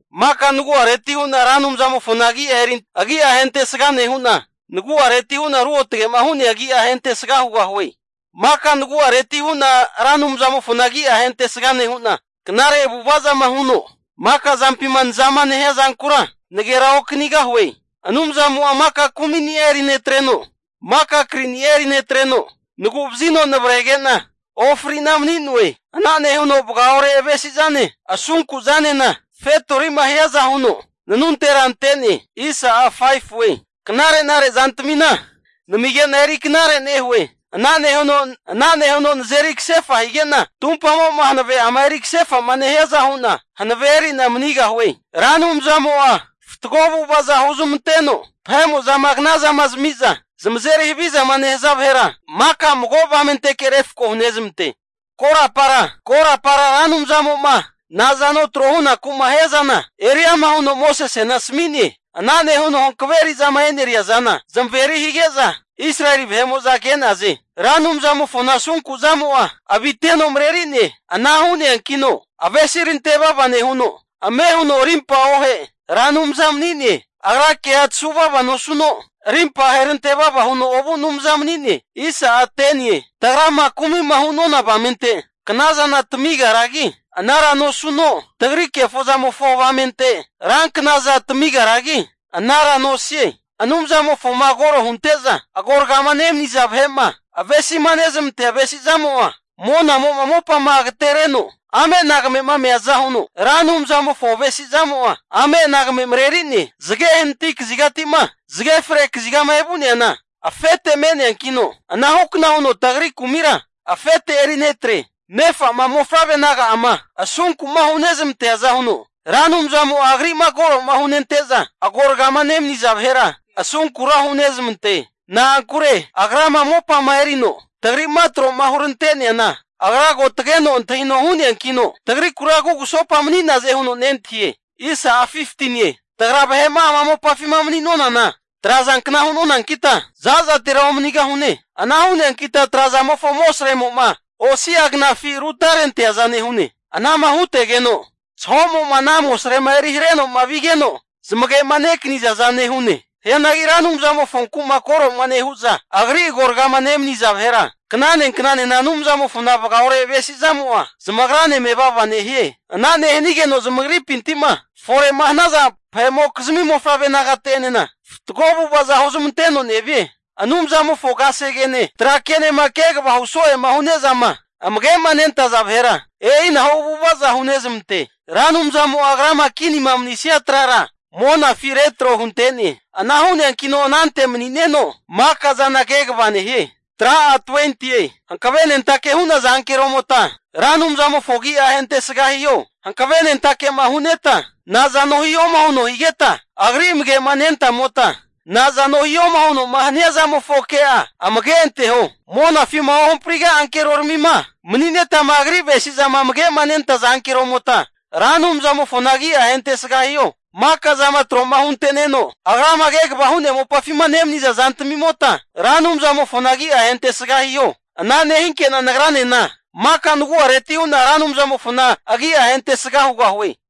Maka nagu'areti hu'na Ra Anumzamofona agi'a ahentesga nehu'na, nagu'areti hu'na ruotage'ma hu'nea agi'a ahentesga hugahue. Maka nagu'areti hu'na Ra Anumzamofona agi'a ahentesga nehu'na, knare avu'ava zama huno maka zampima nazama nehia zankura naganera okanigahue. Anumzamo'a maka kumini'a eri netreno, maka krini'a eri netreno, nagu'vazino navrege'na ofri'na mani'noe. Ana nehuno vagaore avesi zane asunku zanena, fetori'ma hiaza huno nanuntera ante'ne. Anumzamo'a knare'nare zantamina namige'na eri knare nehue. Ana nehu'na nazeri kasefa higena, tumpamo'ma hanave'ama eri kasefa'ma nehiaza hu'na hanavea erina manigahue. Ra Anumzamo'a fatgo avu'avaza huzmanteno, vahe'mo'zama knamazami'za zamazeri havizama nehaza vahera, maka mago avamenteke refko hunezmante. Korapara Ra Anumzamo'ma nazano tro hunaku'ma hiazana eri ama huno Mosesena asami'ne. Ana nehuno hankave eri'zama eneria zana zamaveri hige'za Israeli vahe'mo'za ke'naze. Ra Anumzamofona asunku zamo'a aviteno mareri'ne. Ana hu'neankino, avesi rante vava nehuno, ame huno arimpa ohe Ra Anumza mani'ne. Agra kea tasuvava nosuno, arimpa aherante vava huno ovu Anumza mani'ne. Tagrama kumi'ma hu'nona avamente knazana tamigaragi anara nosuno, tagri kefozamofo avamente ranknaza tamigaragi anara nosie. Anumzamofoma koro hunte'za agoragama nemaniza vahe'ma avesima nezamantea avesizamo'a, monamo'ma mopama agatereno ame'nagame'ma meaza huno Ra Anumzamofo avesi zamo'a ame'nagame mareri'ne. Zage hanati kazigatima zage fre kazigama evu'neana afete me'neankino, anahukna huno tagri kumira afete eri netre. Nefa'ma mofavre naga'ama asunku'ma hunezmanteaza huno, Ra Anumzamo'a Agri'ma koro'ma hunente'za agoragama nemaniza vahera asunkura hunezmante. Na'ankure Agrama mopama erino tagri'ma tro'ma hurante'neana, Agra ko tageno antahino hu'neankino, tagrikura kugusopa mani'naze huno nentahie. Tagra vahe'ma ama mopafima mani'nonana trazankna hu'nonankita za'zatera omanigahune. Ana hu'neankita tra'zamofo amosremo'ma osi'a knafi rutarenteaza nehune. Anama hutegeno zaho'mo ana amosrema eri hare'noma vigeno, zamage'ma nekanizaza nehune. Hianagi Ra Anumzamofonku koro'ma nehu'za Agri agoragama nemaniza vahera, knane knanena Anumzamofona vagaore avesi zamo'a zamagrane mevava nehie. Ana nehanigeno zamagripinti'ma fore'ma hanaza vahe'mokizmi mofavre nagate'enena fatgo avu'ava huzmanteno nevie. Anumzamofo kasegene tra ke'nema kegava huso'ema hu'nezama amage'ma nentaza vahera, e'inahu avu'ava'za hunezmante. Ra Anumzamo'a Agrama kinima manisania trara monafi retro hunte'ne. Ana hu'neankino anante mani'neno, makazana kegava nehie. Hankavenentake hu'naza ankeromota Ra Anumzamofo agi'a ahentesga hiho. Hankavenentake'ma hu'neta, nazano hihoma huno higeta Agri amage'ma nentamota, nazano hihoma huno hania zamofo ke'a amage anteho. Monafima ohampriga'a ankeroramima mani'netama agri avesi'zama amage'manentaza ankeromota, Ra Anumzamofona agi'a ahentesga hiho. Maka zama tro'ma hunte'neno Agrama kegavama hu'nea mopafima nemaniza zantamimota, Ra Anumzamofona agi'a ahentesga hiho. Ana nehinke'na nagranena maka nagu'areti hu'na Ra Anumzamofona agi'a ahentesga hugahue.